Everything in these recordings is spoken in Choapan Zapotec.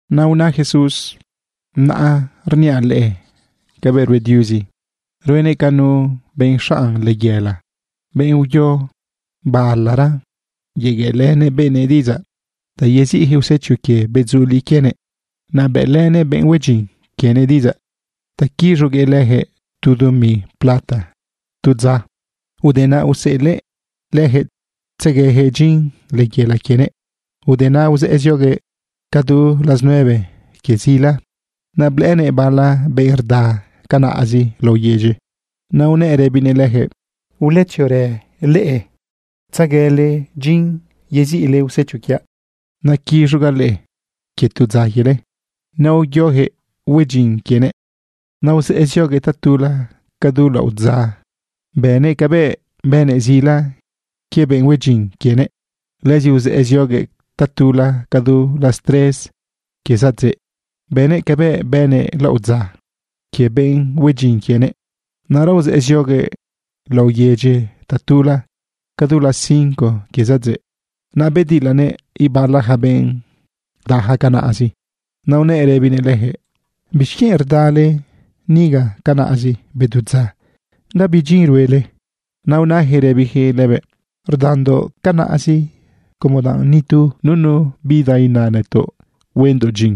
Naꞌ una Jesús: ―Naꞌ rniaꞌ leꞌe cabëꞌ rue Diuzi. Ruenëꞌ ca nu benꞌ xanꞌ layela, benꞌ uyo balara yegueꞌlë benëꞌ diꞌidzaꞌ ta yeziꞌjëꞌ usecho quie bedzuliꞌ quienëꞌ. Naꞌ bëꞌlënëꞌ benꞌ hue dyin quienëꞌ diꞌidzaꞌ ta quiz̃uguëꞌ lëjëꞌ tu dumi plata tu dza. Ude naꞌ useꞌelëꞌ lëjëꞌ tzeguejëꞌ dyin layela quienëꞌ. Ude naꞌ uzëꞌë zioguëꞌ ca du las nueve quie zila. Naꞌ blëꞌënëꞌ bala benꞌ rda canaꞌzi laꞌo yedyi. Naꞌ unëꞌ rëbinëꞌ lëjëꞌ: “Uletziorë leꞌe, tzeguele dyin yeziꞌle usecho quiaꞌ. Naquiz̃ugaꞌ leꞌe quie tu dza quiele.” Naꞌ uyojëꞌ hue dyin quienëꞌ. Naꞌ uzëꞌë zioguëꞌ tatula ca du laꞌodza, bënëꞌ cabëꞌ bënëꞌ zila quie benꞌ hue dyin quienëꞌ. Lëzi uzëꞌë zioguëꞌ tatula ca du las tres quie zadzeꞌ, bënëꞌ cabëꞌ bënëꞌ laꞌodza quie benꞌ hue dyin quienëꞌ. Naꞌra uzëꞌë zioguëꞌ laꞌo yedyi tatula ca du las cinco quie zadzeꞌ. Naꞌ bedilanëꞌ ibala ja benꞌ rdaja canaꞌzi. Naꞌ unëꞌ rëbinëꞌ lëjëꞌ: “¿Bixquienꞌ rda leꞌe niga canaꞌzi bedu dza, gabi dyin ruele?” Naꞌ unajëꞌ rëbijëꞌ lëbëꞌ: “Rdandoꞌ canaꞌzi como danꞌ nitu nunu bida ina nëtoꞌ huendoꞌ dyin.”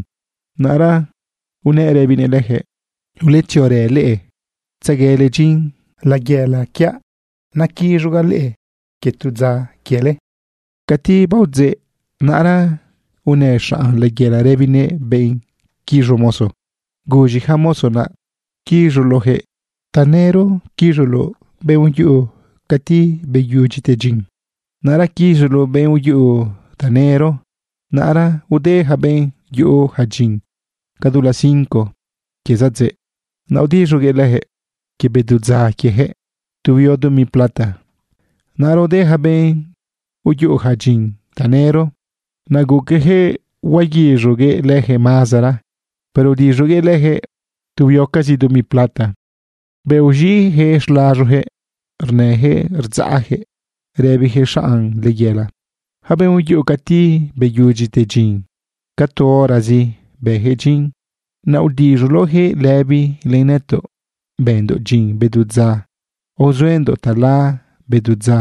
Naꞌra unëꞌ rëbinëꞌ lëjëꞌ: “Uletziorë leꞌe tzeguele dyin layela quiaꞌ. Naquiz̃ugaꞌ leꞌe quie tu dza quiele.” Cati baodzeꞌ, naꞌra unë xanꞌ layela rëbinëꞌ benꞌ quiz̃u mozo: “Guz̃i ja mozo naꞌ, quiz̃uloꞌjëꞌ. Tanëro quiz̃uloꞌ benꞌ uyuꞌu cati beyudyite dyin. Naꞌra quiz̃uloꞌ benꞌ uyuꞌu tanëro.” Naꞌra ude ja benꞌ yuꞌu ja dyin ca du las cinco quie zadzeꞌ. Naꞌ aodiz̃uguëꞌ lëjëꞌ quie bedu dza quiejëꞌ tu huio dumi plata. Naꞌra ude ja benꞌ yuꞌu ja dyin tanëro. Naꞌ guquejëꞌ huaguiz̃uguëꞌ lëjëꞌ mazara. Pero udiz̃uguëꞌ lëjëꞌ tu huiocazi dumi plata. Bëꞌ uz̃iꞌjëꞌ xlaz̃ujëꞌ rnëjëꞌ rdzaꞌjëꞌ rëbijëꞌ xaꞌn layela: “Ja benꞌ uyuꞌu cati beyudyite dyin, ca tu horazi bëjëꞌ dyin. Naꞌ udiz̃uloꞌjëꞌ lëbi len nëtoꞌ bëndoꞌ dyin bedu dza aozuendoꞌ tala bedu dza.”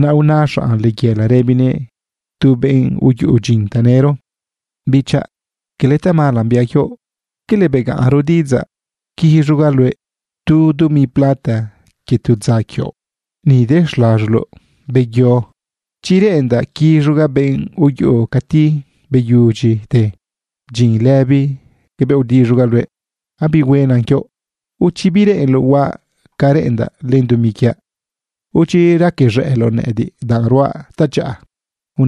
Naꞌ una xanꞌ layela rëbinëꞌ tu benꞌ uyuꞌu dyin tanëro: “Bichaꞌ, quele tamala biaꞌ quioꞌ. ¿Quele begaꞌnro diꞌidzaꞌ quiz̃ugaꞌ luëꞌ tu dumi plata quie tu dza quioꞌ? Ni de xlaz̃uloꞌ, beyo. Chi reꞌendaꞌ quiz̃ugaꞌ benꞌ uyuꞌu cati beyudyite dyin lëbi cabëꞌ aodiz̃ugaꞌ luëꞌ, abihuena quioꞌ. ¿O chi bireꞌenloꞌ huaꞌ ca reꞌendaꞌ len dumi quiaꞌ? ¿O chi raquez̃ëꞌloꞌ nëꞌëdiꞌ danꞌ ruaꞌ tadyaꞌa?”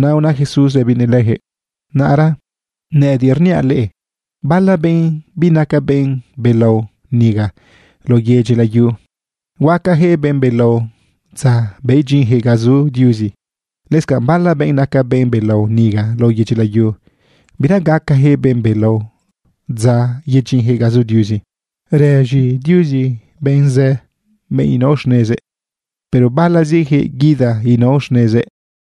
Naꞌ una Jesús rëbinëꞌ lëjëꞌ: ―Naꞌra nëꞌëdiꞌ rniaꞌ leꞌe, bala benꞌ binaca benꞌ belao niga lao yedyi layu, huacajëꞌ benꞌ belao dza yedyinjëꞌ ga zu Diuzi. Lëscanꞌ bala benꞌ naca benꞌ belao niga lao yedyi layu, bira gacajëꞌ benꞌ belao dza yedyinjëꞌ ga zu Diuzi. Rëz̃i Diuzi benꞌ zë, benꞌ inao xnezëꞌ, pero balazijëꞌ guida inao xnezëꞌ.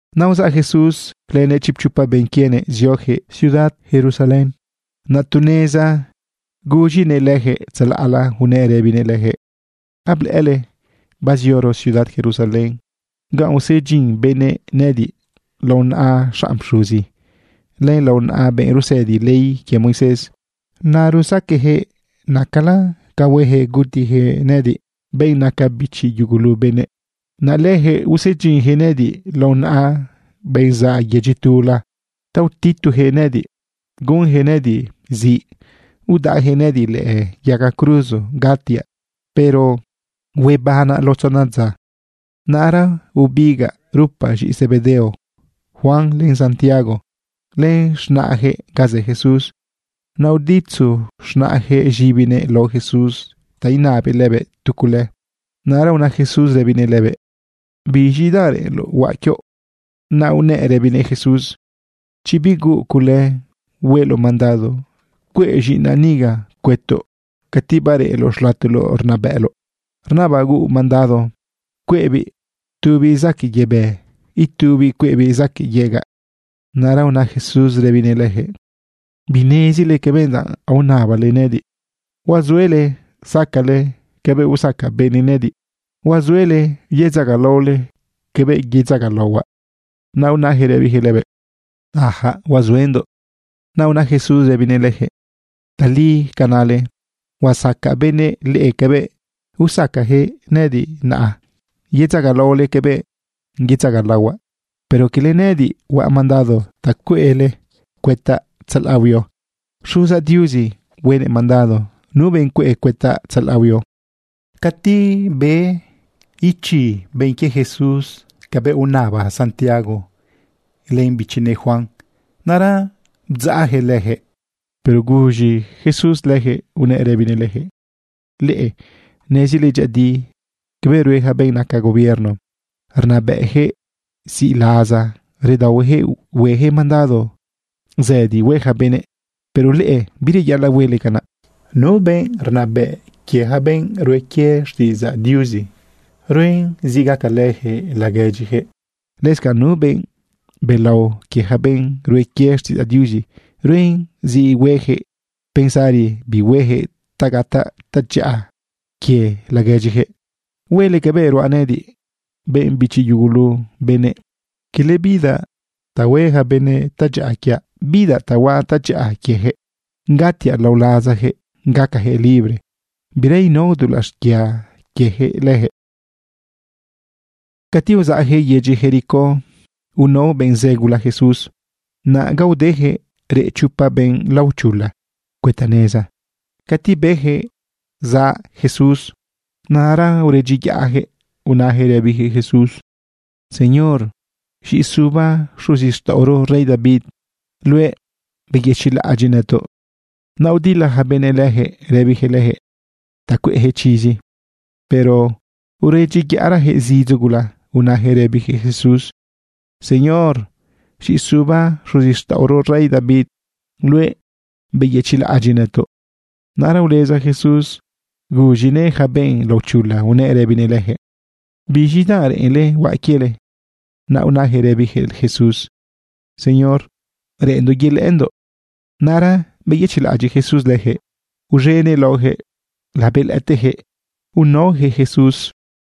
Naꞌ uzaꞌ Jesús lënëꞌ chipchopa benꞌ quienëꞌ ziojëꞌ ciudad Jerusalén. Naꞌ tu neza guz̃inëꞌ lëjëꞌ tzalaꞌla unëꞌ rëbinëꞌ lëjëꞌ: ―Ablëꞌële bazioro ciudad Jerusalén ganꞌ usedyin benëꞌ nëꞌëdiꞌ lao naꞌa xanꞌ pxuzi, len lao naꞌa benꞌ rusëdi ley quie Moisés. Naꞌ rusaqueꞌjëꞌ nëꞌëdiꞌ nacala ca huejëꞌ gutijëꞌ nëꞌëdiꞌ, benꞌ naca bichi yugulu benëꞌ. Naꞌ lëjëꞌ usedyinjëꞌ nëꞌëdiꞌ lao naꞌa benꞌ zaꞌ yedyi tula ta utitujëꞌ nëꞌëdiꞌ, gunjëꞌ nëꞌëdiꞌ ziꞌ, udaꞌjëꞌ nëꞌëdiꞌ lëꞌë yaga cruzo gatiaꞌ. Pero huebanaꞌ lao tzona dza. Naꞌra bebigaꞌ rupa z̃iꞌi Zebedeo, Juan len Santiago, len z̃naꞌjëꞌ ga zë Jesús. Naꞌ uditzu z̃naꞌjëꞌ z̃ibinëꞌ lao Jesús ta inabëꞌ lëbëꞌ tu cule. Naꞌra una Jesús rëbinëꞌ lëbëꞌ: ―¿Biz̃i danꞌ reꞌenloꞌ huaꞌ quioꞌ? Naꞌ unëꞌ rëbinëꞌ Jesús: ―Chi bihuuꞌ cule, hueloꞌ mandado cueꞌ z̃iꞌinaꞌ niga cuëtoꞌ cati bareꞌloꞌ xlatoloꞌ rnabëꞌloꞌ. Rnabaꞌ huuꞌ mandado cueꞌbiꞌ tubiꞌ zaquëꞌ yebë, itubiꞌ cueꞌbiꞌ zaquëꞌ yegaꞌ. Naꞌra una Jesús rëbinëꞌ lëjëꞌ: ―Binezile cabëꞌ danꞌ aonabale nëꞌëdiꞌ. ¿Huazuele sacale cabëꞌ usaca benëꞌ nëꞌëdiꞌ? ¿Huazuele yedzagalaole cabëꞌ yedzagalaohuaꞌ? Naꞌ unajëꞌ rëbijëꞌ lëbëꞌ: ―Ajaꞌ, huazuendoꞌ. Naꞌ una Jesús rëbinëꞌ lëjëꞌ: ―Tali ca nale. Usaca benëꞌ leꞌe cabëꞌ usacajëꞌ nëꞌëdiꞌ, naꞌ yedzagalaole cabëꞌ yedzagalaohuaꞌ. Pero quele nëꞌëdiꞌ huaꞌ mandado ta cueꞌle cuëtaꞌ tzalaꞌ huio. Xuzaꞌ Diuzi huenëꞌ mandado nu benꞌ cueꞌ cuëtaꞌ tzalaꞌ huio. Cati be ichi benꞌ quie Jesús cabëꞌ unaba Santiago len bichinëꞌ Juan, naꞌra bdzaꞌjëꞌ lëjëꞌ. Pero guz̃i Jesús lëjëꞌ unëꞌ rëbinëꞌ lëjëꞌ: ―Leꞌe nezile dyëꞌëdi cabëꞌ rue ja benꞌ naca gobierno, rnabëꞌjëꞌ ziꞌlaza. Redaohuejëꞌ huejëꞌ mandado zëdi hue ja benëꞌ. Pero leꞌe, bireyaꞌalaꞌ huele canaꞌ. Nu benꞌ rnabëꞌ quie ja benꞌ rue quie xtiꞌidzaꞌ Diuzi, ruen zi gacalëjëꞌ laguedyijëꞌ. Lëscanꞌ nu benꞌ belao quie ja benꞌ rue quie xtiꞌidzaꞌ Diuzi, ruen zi huejëꞌ pensari bi huejëꞌ ta gataꞌ tadyaꞌa quie laguedyijëꞌ. Huele cabëꞌ ruaꞌ nëꞌëdiꞌ, benꞌ bichi yugulu benëꞌ. Quele bidaꞌ ta hue ja benëꞌ tadyaꞌa quiaꞌ. Bidaꞌ ta huaꞌ tadyaꞌa quiejëꞌ, gatiaꞌ lao lazajëꞌ gacajëꞌ libre, bira inao dulaꞌ xquia quiejëꞌ lëjëꞌ. Cati uzaꞌjëꞌ yedyi Jericó, unao benꞌ zë gula Jesús. Naꞌ ga udejëꞌ reꞌ chopa benꞌ laochula cuëta neza. Cati bejëꞌ zaꞌ Jesús, naꞌra uredyiyaꞌjëꞌ unajëꞌ rëbijëꞌ Jesús: ―Señor, z̃iꞌi suba xuzixtaꞌoro rey David luëꞌ. Beyëchiꞌlaꞌadyiꞌnëtoꞌ. Naꞌ udila ja benëꞌ lëjëꞌ rëbijëꞌ lëjëꞌ ta cueꞌjëꞌ chizi. Pero uredyiyaꞌrajëꞌ zidzo gula unajëꞌ rëbijëꞌ Jesús: ―Señor, z̃iꞌi suba xuzixtaꞌoro rey David luëꞌ. Beyëchiꞌlaꞌadyiꞌ nëtoꞌ. Naꞌra uleza Jesús guz̃inëꞌ ja benꞌ laochula, unëꞌ rëbinëꞌ lëjëꞌ: ―¿Biz̃i danꞌ reꞌenle huaꞌ quiele? Naꞌ unajëꞌ rëbijëꞌ Jesús: ―Señor, reꞌenndoꞌ yelëꞌëndoꞌ. Naꞌra beyëchiꞌlaꞌadyiꞌ Jesús lëjëꞌ, uz̃enëꞌ laojëꞌ labelëꞌëtejëꞌ unaojëꞌ Jesús.